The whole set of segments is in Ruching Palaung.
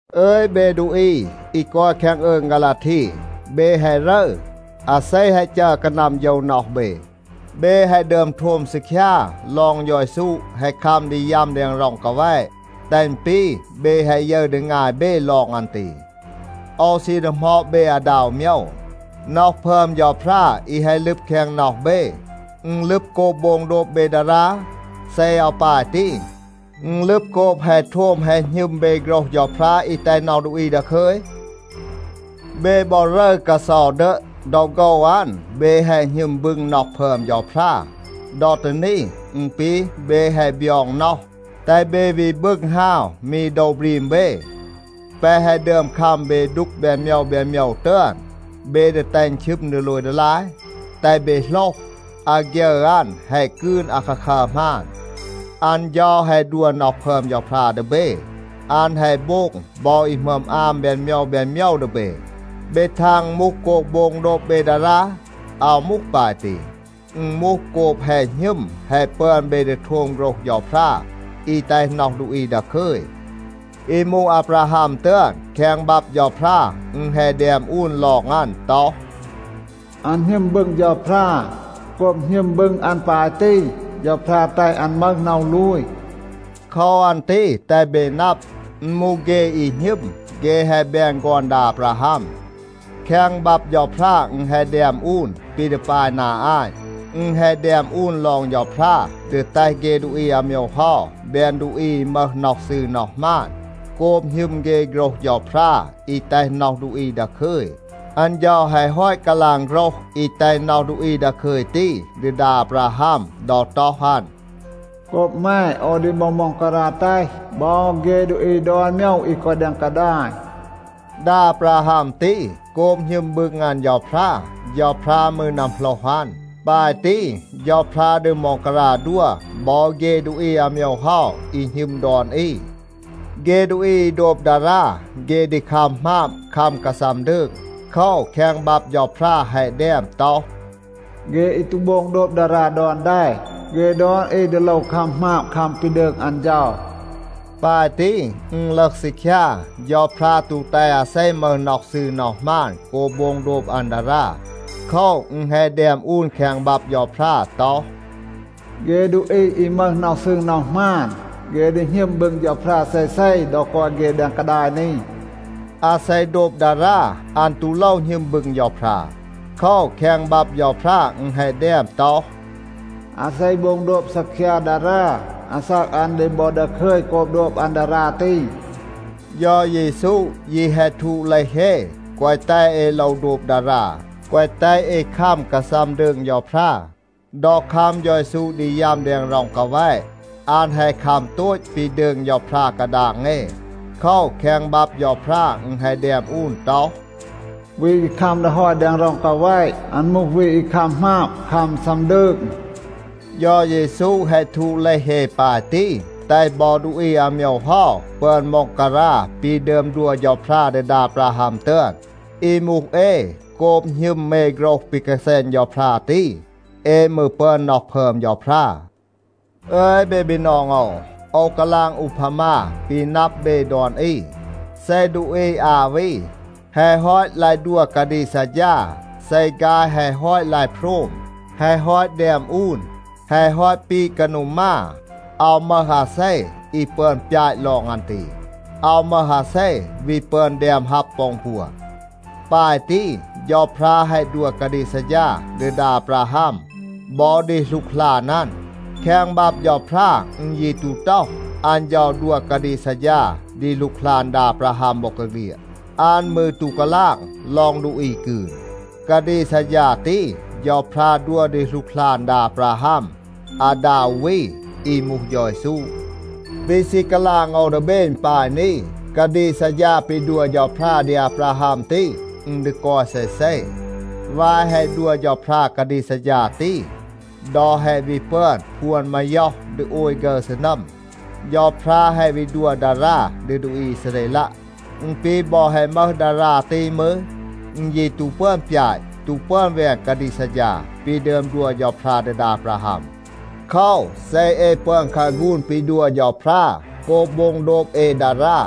อึย เบ ดูอี อี กอย แคง อืง ฆาลาที, เบ แฮะ รึร. อาเซ แฮะ จัร กานัม โฌว น็อห เบ? เบ แฮะ ดึอม โทม ซีคยา ลอง เฌา เยซู แฮะ คัม ดี ยัม แดง ร็อง กาแวะ, แตห อึณ ปี เบ แฮะ ยึร ดี งาย เบ ลอง อัน ตี. โอว ซี ดีหมอด เบ อาดา อู โมยว. น็อห พึอม เฌาพรา อี แฮะ ลึบ แคง น็อห เบ, อึณ ลึบ โกบ โบง โดบ เบ ดารา? เซ อาว ปาย ตี, อึณ ลึบ โกบ แฮะ โทม แฮะ หณึม เบ โฆรห เฌาพรา อี แตห น็อห ดูอี ดาคึย? เบ บอ รึร กาเซา ดึะ. ดอ โฆว อัน, เบ แฮะ หณึม บึง น็อห พึอม เฌาพรา. ดอ ตี นี, อึณ ปี เบ แฮะ บยอง น็อห, แตห เบ วี บึง ฮาว มี โดว บรีม เบ. แปะ แฮะ ดึอม คัม เบ ดูก แบน โมยว แบน โมยว ตึอน, เบ ดี แตห อึณ ชึม ดีโลย ดีลาย? แตห เบ โหลห, อาฆยึร อัน แฮะ กืน อาคาคัร หมาน. อัน เฌา แฮะ ดัว น็อห พึอม เฌาพรา ดี เบ. อัน แฮะ โบง บอ อี หมึอม อาม แบน โมยว แบน โมยว ดี เบ. เบ ทาง อึณ มูห โกบ โบง โดบ เบ ดารา? อาว มูห ปาย ตี, อึณ มูห โกบ แฮะ หณึม แฮะ ปึอน เบ ดี โทม โฆรห เฌาพรา อี แตห น็อห ดูอี ดาคึย. อี มูห อาบราฮัม ตึอน, แคง บับ เฌาพรา อึณ แฮะ แดม อูน ลอง อัน ต็อห, “อัน หณึม บึง เฌาพรา. โกบ หณึม บึง อัน ปาย ตี, เฌาพรา แตห อัน มึห น็อห ลูย.” โคว อัน ตี แตห เบ นับ, อึณ มูห เฆ อี หณึม, เฆ แฮะ แบน ฆอน ดา อาบราฮัม. แคง บับ เฌาพรา อึณ แฮะ แดม อูน ปี ดี ปาย นา อาต. อึณ แฮะ แดม อูน ลอง เฌาพรา ดี แตห เฆ ดูอี อาโมยว เฮา แบน ดูอี อี มึห น็อห ซืร น็อห หมาน โกบ หณึม เฆ โฆรห เฌาพรา อี แตห น็อห ดูอี ดาคึย. อัน เฌา แฮะ ฮอต กาลาง โฆรห อี แตห น็อห ดูอี ดาคึย ตี ดี ดา อาบราฮัม ดอ ต็อห อัน, “โกบ แม, โอว ดี บอ ม็องการา แตห บอ เฆ ดูอี ดอน โมยว อี กอย แดง กาดาย.” ดา อาบราฮัม ตี, โกบ หณึม บึง อัน เฌาพรา, เฌาพรา มืร นัมโหลห อัน. ปาย ตี, เฌาพรา ดี ม็องการา ดัว บอ เฆ ดูอี อาโมยว เฮา อี หณึม ดอน อี. เฆ ดูอี อี โดบ ดารา, เฆ ดี คัม หมาบ, คัม กาซัม ดืง. โคว, แคง บับ เฌาพรา แฮะ แดม ต็อห, “เฆ อี ตู โบง โดบ ดารา ดอน แด, เฆ ดอน อี ดี โลว คัม หมาบ, คัม ปี ดืง อัน เฌา.” ปาย ตี อึณ ลึห ซีคยา, เฌาพรา ตู แตห อาเซ มึห น็อห ซืร น็อห หมาน โกบ โบง โดบ อัน ดารา. โคว, อึณ แฮะ แดม อูน แคง บับ เฌาพรา ต็อห, “เฆ ดูอี อี มึห น็อห ซืร น็อห หมาน, เฆ ดี หณึม บึง เฌาพรา เซเซ ดอ กอย เฆ แดง กาดาย นี.” อาเซ โดบ ดารา, อัน ตู โลว หณึม บึง เฌาพรา. โคว, แคง บับ เฌาพรา อึณ แฮะ แดม ต็อห, “อาเซ โบง โดบ ซีคยา ดารา, อาซาก อัน ดี บอ ดาคึย โกบ โดบ อัน ดารา ตี.” เฌา เยซู ยี แฮะ ทูด เลห เอ, แกวะ แตห เอ โลว โดบ ดารา, แกวะ แตห เอ คัม กาซัม ดืง เฌาพรา. ดอ คัม เฌา เยซู ดี ยัม แดง ร็อง กาแวะ, อัน แฮะ คัม โตต ปี ดืง เฌาพรา กาดาง เอ. โคว, แคง บับ เฌาพรา อึณ แฮะ แดม อูน ต็อห, “วี อี คัม ดี ฮอย แดง ร็อง กาแวะ, อัน มูห วี อี คัม หมาบ, คัม ซัม ดืง.” เฌา เยซู แฮะ ทูด เลห เอ ปาย ตี, แตห บอ ดูอี อาโมยว เฮา ปึอน ม็องการา ปี ดึอม ดัว เฌาพรา ดี ดา อาบราฮัม ตึอน. อี มูห เอ, โกบ หณึม เอ โฆรห ปี กาแซณ เฌาพรา ตี, เอ มืร ปึอน น็อห พึอม เฌาพรา. อึย เบ บีนอง โอว, โอว กาลาง อูพามา ปี นับ เบ ดอน อี. เซ ดูอี อา วี แฮะ ฮอต ลาย ดัว กาดีก ซัดฌา, เซ ฆาย แฮะ ฮอต ลาย โพรม, แฮะ ฮอต แดม อูน, แฮะ ฮอต ปีด กานู มา, อาว มึห อาเซ อี ปึอน ปยาต ลอง อัน ตี. อาว มึห อาเซ วี ปึอน แดม ฮับ ปอ อึณ ปัว. ปาย ตี, เฌาพรา แฮะ ดัว กาดีก ซัดฌา ดี ดา อาบราฮัม บอ ดี หลูกหลาน อัน. แคง บับ เฌาพรา อึณ ยี ตู ต็อห, อัน เฌา ดัว กาดีก ซัดฌา ดี หลูกหลาน ดา อาบราฮัม บอกาเฆลียด. อัน มืร ตู กาลาง ลอง ดูอี กืน. กาดีก ซัดฌา ตี เฌาพรา ดัว ดี หลูกหลาน ดา อาบราฮัม อาดา อู วี, อี มูห เฌา เยซู. ปี ซี กาลาง โอว ดี เบ อึณ ปาย นี. กาดีก ซัดฌา ปี ดัว เฌาพรา ดี อาบราฮัม ตี, อึณ ดี กอย เซเซ. วาย แฮะ ดัว เฌาพรา กาดีก ซัดฌา ตี, ดอ แฮะ วี ปึอน พวน มาย็อห ดี โอย ฆึร ซีนัม, เฌาพรา แฮะ วี ดัว ดารา ดี ดูอี อีซาเรลัะ. อึณ ปี บอ แฮะ มึห ดารา ตี มืร, อึณ ยี ตู ปึอน ปยาต, ตู ปึอน แวน กาดีก ซัดฌา ปี ดึอม ดัว เฌาพรา ดี ดา อาบราฮัม. โคว, เซ เอ ปึอน คาฆูน ปี ดัว เฌาพรา โกบ โบง โดบ เอ ดารา,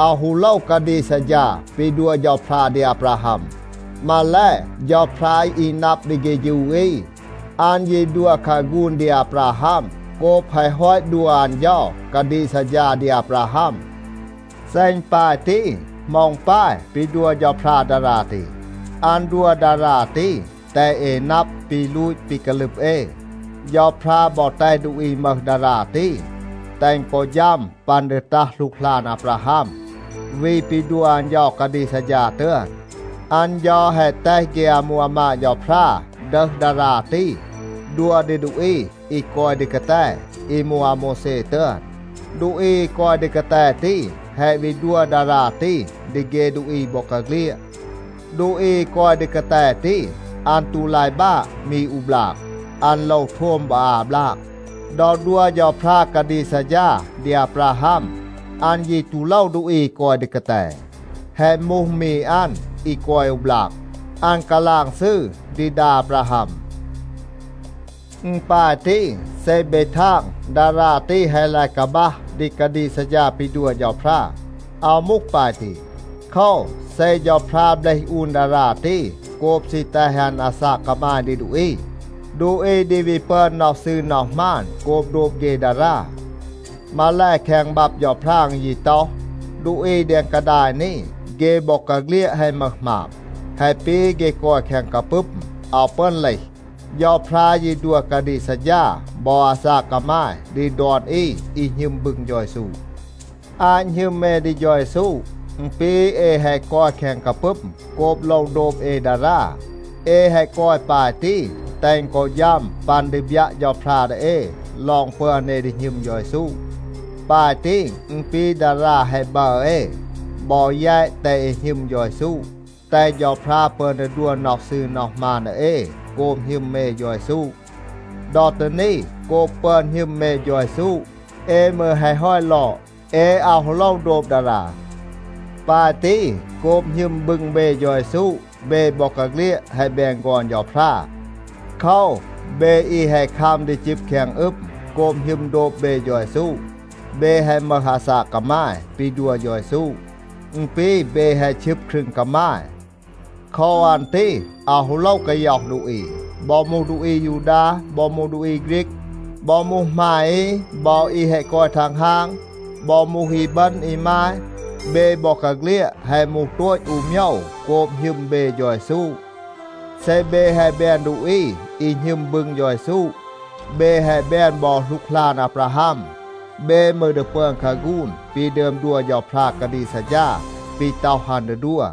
อาว ฮู โลว กาดีก ซัดฌา ปี ดัว เฌาพรา ดี อาบราฮัม. มาแล, เฌาพรา อี นับ ดี เฆฌู อี, อัน ยี ดัว คาฆูน ดี อาบราฮัม โกบ แฮะ ฮอต ดัว อัน เฌา กาดีก ซัดฌา ดี อาบราฮัม. เซ อึณ ปาย ตี, เหมา อึณ ปาย ปี ดัว เฌาพรา ดารา ตี? อัน ดัว ดารา ตี, แตห เอ นับ ปี ลูต ปี กาลึบ เอ. เฌาพรา บอ แตห ดูอี มึห ดารา ตี, แตห อึณ กอ ฌัม ปัน ดี ตัห หลูกหลาน อาบราฮัม, วี ปี ดัว อัน เฌา กาดีก ซัดฌา ตึอน. อัน เฌา แฮะ แตห เฆ อามู อามาด เฌาพรา ดึห ดารา ตี, ดัว ดี ดูอี อี กอย ดี กาแต, อี มูห อาโมวแซ ตึอน. ดูอี อี กอย ดี กาแต ตี แฮะ วี ดัว ดารา ตี ดี เฆ ดูอี บอกาเฆลียด. ดูอี อี กอย ดี กาแต ตี, อัน ตู ลาย บาะ มี อู บลาก. อัน โลว โทม บอ อา บลาก. ดอ ดัว เฌาพรา กาดีก ซัดฌา ดี อาบราฮัม, อัน ยี ตู โลว ดูอี อี กอย ดี กาแต. แฮะ มูห มี อัน อี กอย อู บลาก, อัน กาลาง ซืร ดี ดา อาบราฮัม. อึณ ปาย ตี. เซ เบ ทาง, ดารา ตี แฮะ ลาย กาบัห ดี กาดีก ซัดฌา ปี ดัว เฌาพรา, อาว มูห ปาย ตี. โคว, เซ เฌาพรา เบลห อูน ดารา ตี โกบ ซี แตห อัน อาซาก กามาย ดี ดูอี, ดูอี ดี วี ปึอน น็อห ซืร น็อห หมาน โกบ โดบ เฆ ดารา. มาแล, แคง บับ เฌาพรา อึณ ยี ต็อห, ดูอี แดง กาดาย นี, เฆ บอกาเฆลียด แฮะ มึห หมาบ. แฮะ ปี เฆ กอย แคง กาปึม, อาว ปึอน เลห. เฌาพรา ยี ดัว กาดีก ซัดฌา บอ อาซาก กามาย ดี ดอน อี อี หณึม บึง เฌา เยซู. อาต หณึม เอ ดี เฌา เยซู, อึณ ปี เอ แฮะ กอย แคง กาปึม โกบ โลว โดบ เอ ดารา. เอ แฮะ กอย ปาย ตี, แตห อึณ กอ ฌัม ปัน ดี บยัะ เฌาพรา ดี เอ ลอง ปึอน เอ ดี หณึม เฌา เยซู. ปาย ตี, อึณ ปี ดารา แฮะ บัร เอ, บอ แยต แตห เอ หณึม เฌา เยซู, แตห เฌาพรา ปึอน ดี ดัว น็อห ซืร น็อห หมาน ดี เอ โกบ หณึม เอ เฌา เยซู. ดอ ตี นี, โกบ ปึอน หณึม เอ เฌา เยซู, เอ มืร แฮะ ฮอต ลอด. เอ อาว ฮู โลว โดบ ดารา. ปาย ตี, โกบ หณึม บึง เบ เฌา เยซู, เบ บอกาเฆลียด แฮะ แบน ฆอน เฌาพรา. โคว, เบ อี แฮะ คัม ดี จึบ แคง อึม โกบ หณึม โดบ เบ เฌา เยซู, เบ แฮะ มึห อาซาก กามาย ปี ดัว เฌา เยซู. อึณ ปี เบ แฮะ ชึบ ครึง กามาย. โคว อัน ตี อาว ฮู โลว กาย็อห ดูอี. บอ มูห ดูอี อายูดา บอ ดูอี ฆรีก, บอ มูห หมาย อี บอ อี แฮะ กอย ทังฮาง, บอ มูห อีบึณ อีมาย, เบ บอกาเฆลียด แฮะ มูห โตต อู โมยว โกบ หณึม เบ เฌา เยซู. เซ เบ แฮะ แบน ดูอี อี หณึม บึง เฌา เยซู, เบ แฮะ แบน บอ หลูกหลาน อาบราฮัม. เบ มืร ดี ปึอน คาฆูน ปี ดึอม ดัว เฌาพรา กาดีก ซัดฌา, ปี ต็อห อัน ดี ดัว.